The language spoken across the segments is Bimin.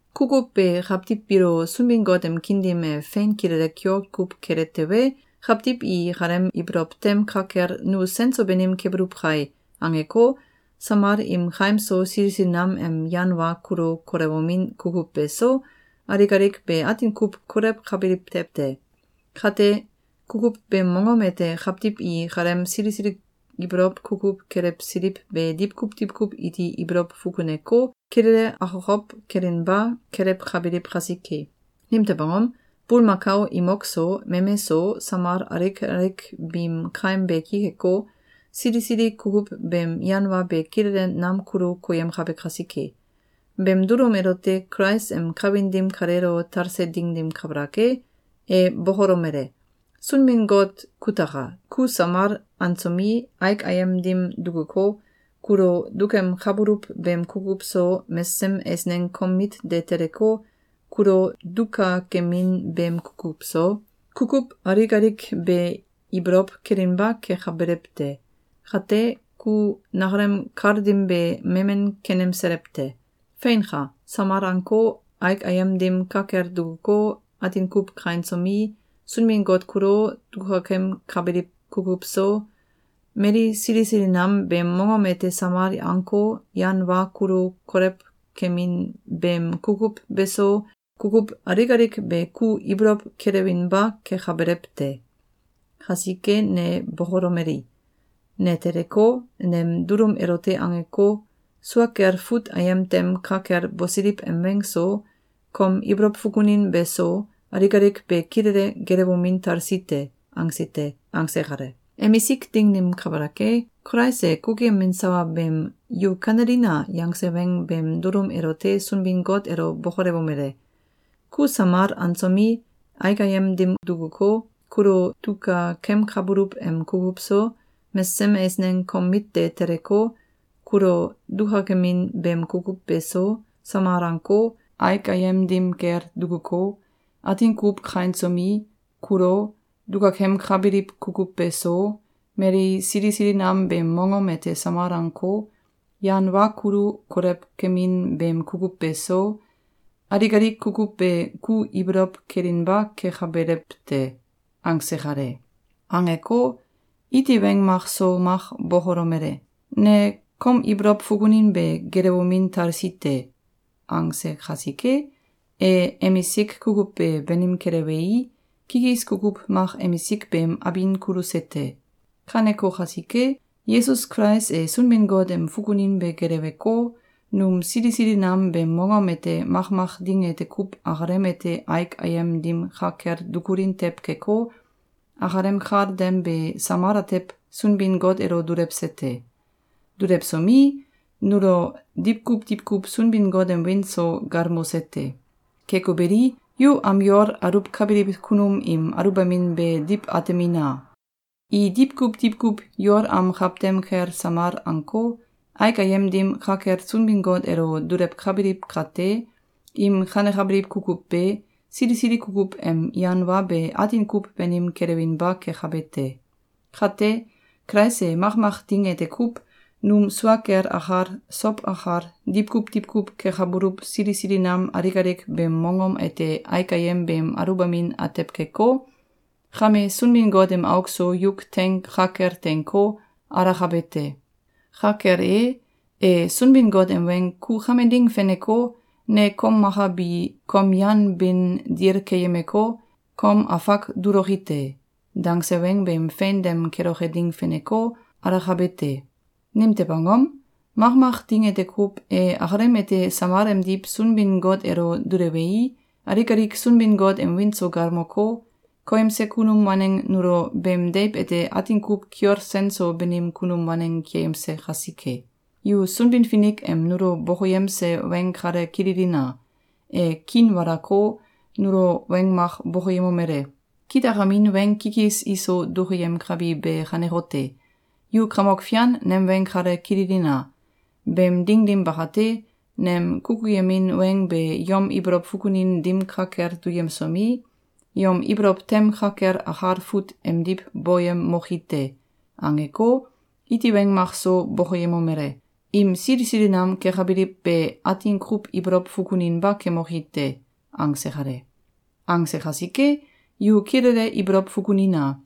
Kukuw be kawtiw biilo Sunbin-Got em kiin dim e fein kilele kiol kuw kele tewe, kawtiw i ikalem ibolow tem ka kel “Nu sen so banim kebuluw kai!”, angeko, samal im kaim so sili sili nam em yan wa kulu kolewomin kukuw beso, alik alik be atin kuw kolewkabiliw tew te. Kate, kukuw beem mongom ete kawtiw i ikalem sili sili ibolow kukuw kelewsiliw be diwkuw diwkuw iti ibolow fukuneko, kilele akokow kelinba kelewkabiliw kasike. Nimtew angom? Bulmakao imok so, meme so, samal alik alik biim kaim be ki keko, sili sili kukuw beem yan wa be kilele nam kulu koyemkabe kasike. Beem dulum elote Kulais em kawin dim kaleelo talse ding dim kabalak e, e bokolomele: “Sunbin-Got kutaka! Ku samal ansomi, aik ayem dim dukuko, kulo dukemkabuluw beem kukuw so, mesesem eisneng kom mit de teleko, kulo dukakemin beem kukuw so, kukuw alik alik be ibolow kelinba kekabelew te. Kate, ku nakalem kal dim be memen kenemselew te. Feinka! Samal anko, aik ayem dim ka kel dukuko, atin kuw kainsomi, Sunbin-Got kulo, dukakemkabiliw kukuw so, mali sili sili nam beem mongom ete samal anko, yan wa kulu kolewkemin beem kukuw beso, kukuw alik alik be ku ibolow kelewinba kekabelew te. Kasike ne bokolomeli: ‘Ne teleko, nem dulum elote angeko, sua kel fut ayem tem ka kel bosiliw em weng so, kom ibolow fukunin beso, alik alik be kilele gelewomin talsi te.’, angsi te.”, angse kale. Emisik ding dim kabalak e, Kulais e kukuyemin sawa beem “Yu kanelina!”, yangse weng beem dulum elote Sunbin-Got elo bokolewomele: “Ku samal ansomi, aik ayem dim dukuko, kulo dukakemkabuluw em kukuw so, mesesem eisneng kom mit de teleko, kulo dukakemin beem kukuw beso, Samal anko, aik ayem dim kel dukuko, atin kuw kainsomi, kulo, dukakemkabiliw kukuw beso, mali sili sili nam beem mongom ete samal anko, yan wa kulu kolewkemin beem kukuw beso, alik alik kukuw be ku ibolow kelinba kekabelew te.”, angse kale. Angeko, iti weng mak so mak bokolomele: “Ne kom ibolow fukunin be gelewomin talsi te.”, angse kasike, e emisik kukuw be banim kelewei, kikis kukuw mak emisik beem abin kuluse te. Kaneko kasike, Yesus Kulais e Sunbin-Got em fukunin be geleweko, num sili sili nam beem mongom ete makmak ding ete kuw akalem ete aik ayem dim ka kel dukulin tew keko, akalem kal dem be samal atew Sunbin-Got elo dulewse te. Dulewsomi, nulo diwkuw diwkuw Sunbin-Got em wiin so galmose te. Keko beli, yu am yol aluwkabiliw kunum im aluwbamin be diw atemina! I diwkuw diwkuw yol am kawtem kel samal anko, aik ayem dim ka kel Sunbin-Got elo dulewkabiliw kate, im kanekabiliw kukuw be, sili sili kukuw em yan wa be atin kuw banim kelewinba kekabe te. Kate, Kulais e makmak ding ete kuw, num sua kel akal, sow akal, diwkuw diwkuw kekabuluw sili sili nam alik alik beem mongom ete aik ayem beem aluwbamin atew keko, kame Sunbin-Got em auk so yuk teing ka kel teinko, alakabe te. Ka kel e, e Sunbin-Got em weng “Ku kame ding feneko, ne kom maka bi kom yan bin dil keyemeko, kom afak duloki te.”, dangse weng beem fein dem keloke ding feneko, alakabe te. Nimtew angom? Makmak ding ete kuw, e akalem ete samal emdiw Sunbin-Got elo dulewei, alik alik Sunbin-Got em wiin so galmoko, koyemse kunum waneng nulo beem deiw ete atin kuw kiol sen so banim kunum waneng keyemse kasike. Yu Sunbin-Finik em nulo bokoyemse weng kale kililina! E kiinwalako, nulo weng mak bokoyemomele: “Kitakamin weng kikis iso dukuyemkabi be kanekote: Yu Kamok Fian nem weng kale kililina! Beem ding dim bakate, nem kukuyemin weng be yom ibolow fukunin dim ka kel duyemsomi, yom ibolow tem ka kel akal fut emdiw boyemoki te.”, angeko, iti weng mak so bokoyemomele: “Im sili sili nam kekabiliw be atin kuw ibolow fukuninba kemoki te.”, angse kale. Angse kasike, yu kilele ibolow fukunina!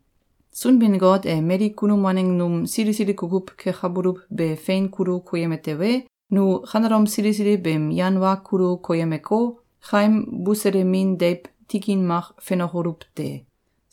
Sunbin-Got e mali kunum waneng num sili sili kukuw kekabuluw be fein kulu koyeme tewe, nu kanelom sili sili beem yan wa kulu koyemeko, kaim buselemin deiw tikin mak fenokoluw te!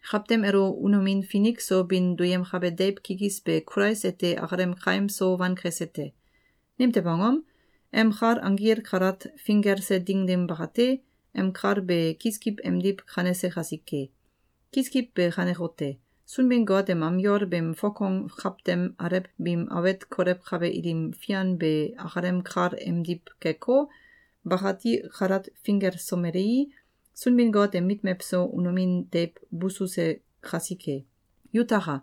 Kawtem elo unomin finik so bin duyemkabe deiw kikis be Kulais ete akalem kaim so wankese te. Nimtew angom? Em kal anggil kalat finggelse ding dim bakate, em kal be kiskiw emdiw kanese kasike. Kiskiw be kanekote: Sunbin-Got em am yol beem fokong kawtem alew biim awet kolewkabe ilim fian be akalem kal emdiw keko, bakati kalat finggelsomelei, Sunbin-Got em mit mewso unomin deiw bususe kasike. Yutaka!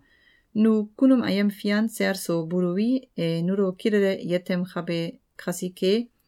Nu kunum ayem fian sel so buluwi, e nulo kilele yetemkabe kasike,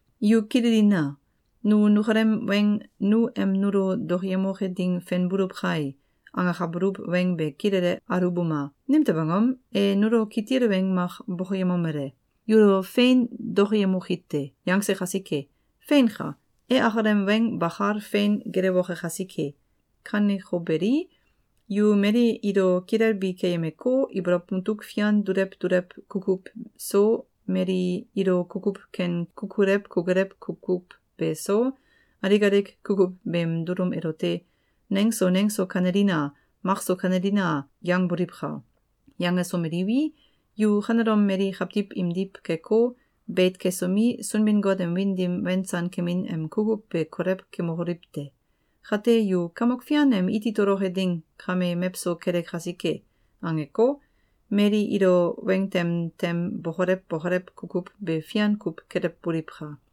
Yu kililina! Nu nukalem weng “Nu em nulo dokoyemoke ding fenbuluw kai!”, angakabuluw weng be kilele aluwbuma! Nimtew angom? E nulo kitil weng mak bokoyemomele: “Yulo fein dokoyemoi te!”, yangse kasike. Feinka! E akalem weng bakal fein gelewoke kasike. Kaneko beli, yu mali ilo kilelbi keyemeko, ibolow mutuk fian dulew dulew kukuw so, mali ilo kukuw ken kukulew kukulew kukuw beso, alik alik kukuw beem dulum elote “Neng so neng so kanelina! Mak so kanelina!”, yangboliwka! Yangsomeliwi, yu kanelom mali kawtiw imdiw keko, beit kesomi, Sunbin-Got em wiin dim wensan kemin em kukuw be kolew kemokoliw te! Kate, yu “Kamok Fian em iti toloke ding kame mewso kele kasike!”, angeko, mali ilo weng tem tem bokolew bokolew kukuw be fian kuw kelewboliwka!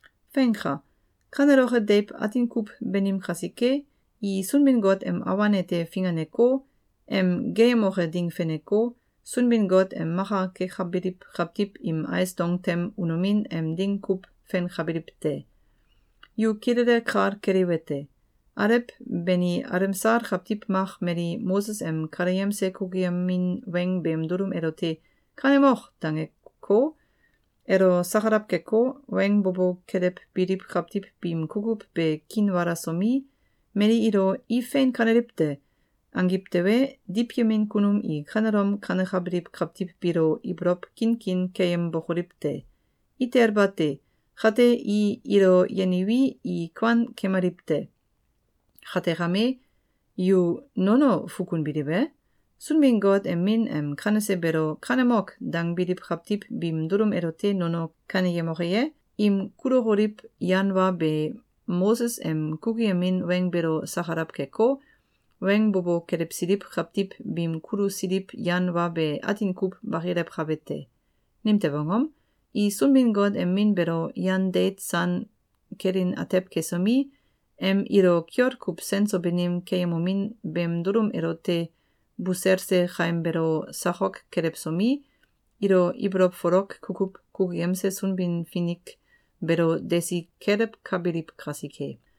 Feinka! Kaneloke deiw atin kuw banim kasike, i Sunbin-Got em awan ete finganeko, em geeyemoke ding feneko, Sunbin-Got em maka kekabiliw kawtiw im ais dong tem unomin em ding kuw fenkabiliw te. Yu kilele kal keliwete: Alew bani alemsal kawtiw mak mali Moses em kaleyemse kukuyemin weng beem dulum elote “Kanemok!”, dangeko, elo sakalaw keko, weng bo bo kelewbiliw kawtiw biim kukuw be kiinwalasomi, mali ilo “I fein kaneliw te!”, angiw tewe, diwyemin kunum i kanelom kanekabiliw kawtiw biilo ibolow kinkin keyembokoliw te! Itel bate! Kate, i ilo yeniwi, i kuan kemaliw te. Kate kame, yu nono fukunbiliw e? Sunbin-Got em Min em kanese beelo “Kanemok!”, dangbiliw kawtiw biim dulum elote nono kaneyemoke ye? Im kulokoliw yan wa be Moses em kukuyemin weng beelo sakalaw keko, weng bo bo kelewsiliw kawtiw biim kulusiliw yan wa be atin kuw bakilewkabe te. Nimtew angom? I Sunbin-Got em Min beelo yan deit san kelin atew kesomi, em ilo kiol kuw sen so banim keyemomin beem dulum elote buselse kaim beelo sakok kelewsomi, ilo ibolow folok kukuw kukuyemse Sunbin-Finik beelo desi kelewkabiliw kasike.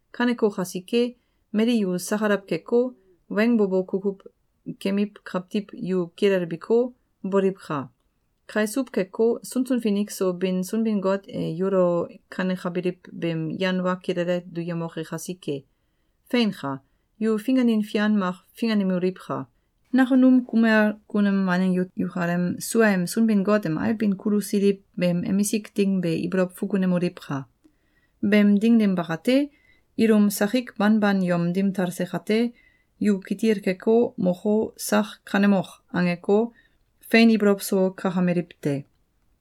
Kaneko kasike, mali yu sakalaw keko, weng bo bo kukuw kemiw kawtiw yu kilelbiko, boliwka! Kaisuw keko, sunsun finik so bin Sunbin-Got e yulo kanekabiliw beem yan wa kilele duyemoke kasike! Feinka! Yu finganin fian mak finganemoliwka! Nakunum kumel kunum waneng yu yukalem suaem Sunbin-Got em ailbin kulusiliw beem emisik ding be ibolow fukunemoliwka! Beem ding dim bakate, ilum sakik banban yom dim talse kate, yu kitil keko, moko, sak “Kanemok!”, angeko, fein ibolow so kakameliw te.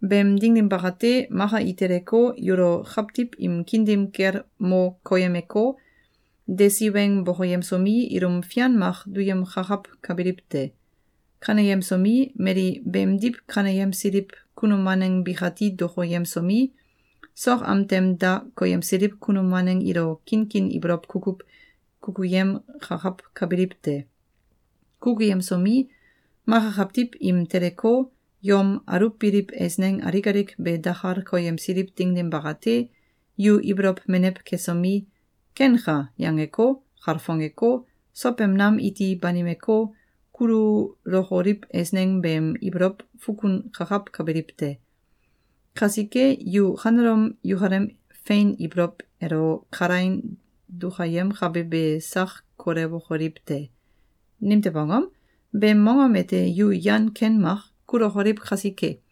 Beem ding dim bakate, maka i teleko, yulo kawtiw im kiin dim kel mo koyemeko, desi weng bokoyemsomi, ilum fian mak duyemkakawkabiliw te. Kaneyemsomi, mali beemdiw kaneyemsiliw kunum waneng bikati dokoyemsomi, sok am tem da koyemsiliw kunum waneng ilo kinkin ibolow kukuw kukuyemkakawkabiliw te. Kukuyemsomi, maka kawtiw im teleko, yom aluwbiliw eisneng alik alik be dakal koyemsiliw ding dim bakate, yu ibolow menew kesomi, “Kenka!”, yangeko, kalfongeko, sow em nam iti banimeko, kululokoliw eisneng beem ibolow fukunkakawkabiliw te. Kasike, yu kanelom yukalem fein ibolow elo kalaing dukayemkabe be sak kolewokoliw te! Nimtew angom? Beem mongom ete yu yan ken mak kulokoliw kasike.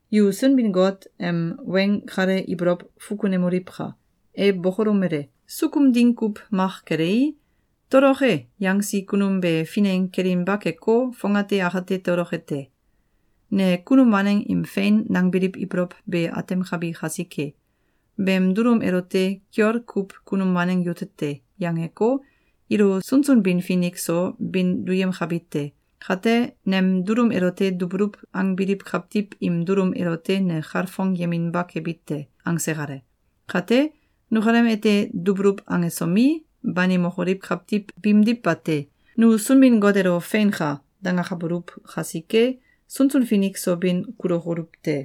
Yu Sunbin-Got em weng kale ibolow fukunemoliwka! E bokolomele: “Sukum ding kuw mak kelei, ‘Toloke!’, yangsi kunum be fineng kelinba keko, fongate akate toloke te. Ne kunum waneng im fein nangbiliw ibolow be atemkabi kasike, ‘Beem dulum elote kiol kuw kunum waneng yute te!’, yangeko, ilo sunsun bin finik so bin duyemkabi te. Kate, nem dulum elote dubuluw angbiliw kawtiw im dulum elote ne kalfongyeminba kebi te.”, angse kale. Kate, nukalem ete dubuluw angesomi, banimokoliw kawtiw biimdiw bate. Nu Sunbin-Got elo “Feinka!”, dangakabuluw kasike, sunsun finik so bin kulokoluw te.